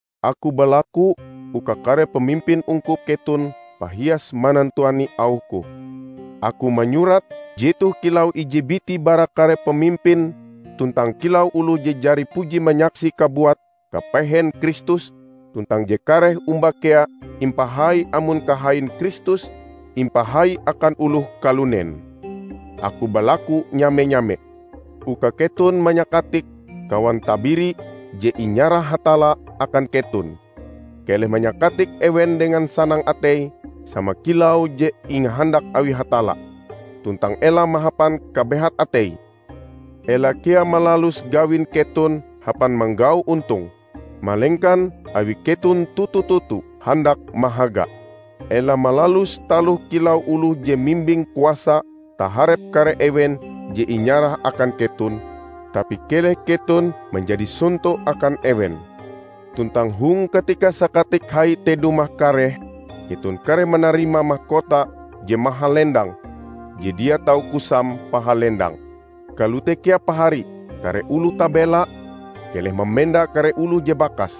Aku balaku uka kare pamimpin ungkup keton pahias manantuani auhku. Aku manyurat jetoh kilau ije biti bara kare pamimpin tuntang kilau oloh je jari puji manyaksi kabuat kapehen Kristus tuntang je kareh omba kea impahai amon kahain Kristus impahai akan oloh kalunen. Aku balaku nyame-nyame uka keton manyakatik kawan tabiri je inyarah Hatalla akan keton. Keleh manyakatik ewen dengan sanang atei sama kilau je ingahandak awi Hatalla, tuntang ela mahapan kabehat atei. Ela kea malalus gawin keton hapan manggau ontong, malengkan awi keton toto-toto handak mahaga. Ela malalus taloh kilau oloh je mimbing kuasa taharep kare ewen je inyarah akan keton, tapi keleh keton manjadi sonto akan ewen. Tuntang hong katika Sakatik Hai te dumah kareh, keton kareh manarima makota je mahalendang je dia tau kusam pahalendange. Kalote kea pahari, kare oloh tabela. Keleh mamenda kare oloh je bakas.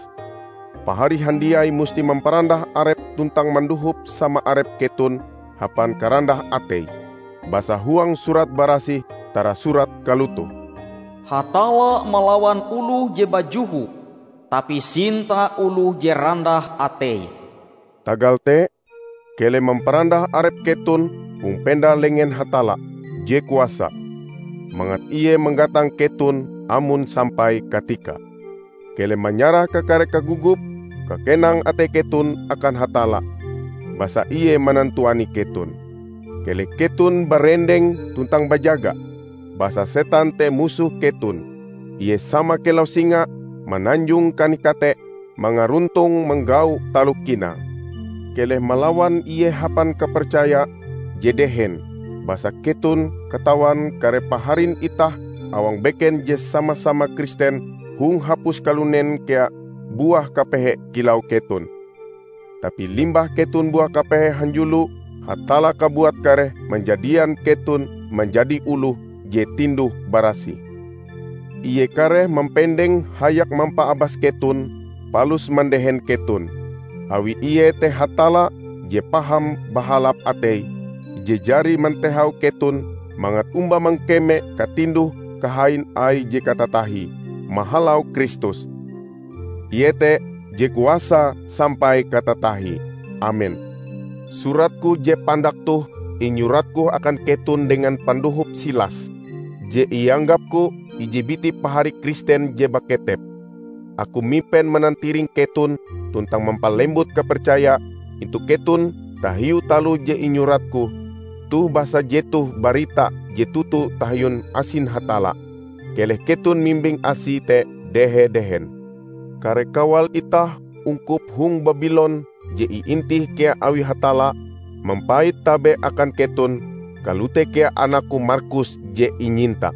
Pahari handiai musti mamparandah arep tuntang mandohop sama arep keton hapan karandah atei. Basa huang Surat Barasih tarasurat kalotoh, "Hatalla malawan oloh je bajoho, tapi sinta oloh je randah atei." Tagal te, keleh mamparandah arep keton hong penda lengen Hatalla je kuasa, mangat ie manggatang keton amon sampai katikae. Keleh manyarah kakare kagogop-kakenang atei keton akan Hatalla, basa ie manantuani keton. Keleh keton barendeng tuntang bajaga! Basa setan te musoh keton. Ie sama kilau singa mananjong kanih-kate mangaruntong manggau taloh kinae. Keleh malawan ie hapan kapercaya je dehen, basa keton katawan kare paharin itah awang beken je sama-sama Kristen hong hapus kalunen kea buah kapehe kilau keton. Tapi limbah keton buah kapehe hanjulo, Hatalla kabuat kareh manjadian keton manjadi oloh je tinduh barasih. Ie kareh mampendeng hayak mampaabas keton palus mandehen keton. Awi ie te Hatalla je paham bahalap atei, je jari mantehau keton mangat omba mangkeme katinduh-kahain Aie je katatahie mahalau Kristus. Ie te je kuasa sampai katatahie! Amen. Suratku je pandak toh inyuratku akan keton dengan pandohop Silas, je ianggapku ije biti pahari Kristen je baketep. Aku mipen manantiring keton tuntang mampalembut kapercaya intu keton tahiu taloh je inyuratku toh basa jetoh barita je toto tahiu asin Hatalla. Keleh keton mimbing asi te dehe-dehen. Kare kawal itah ungkup hong Babilon je iintih kea awi Hatalla, mampait tabe akan keton; kalote kea anakku Markus je inyinta.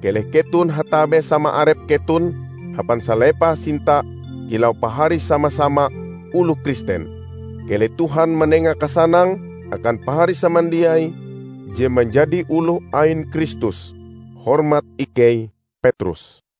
Kaleh keton hatabe sama arep keton hapan salepah sinta kilau pahari sama-sama oloh Kristen. Keleh Tuhan manenga kasanang akan pahari samandiai je manjadi oloh ain Kristus. Hormat ikei, Petrus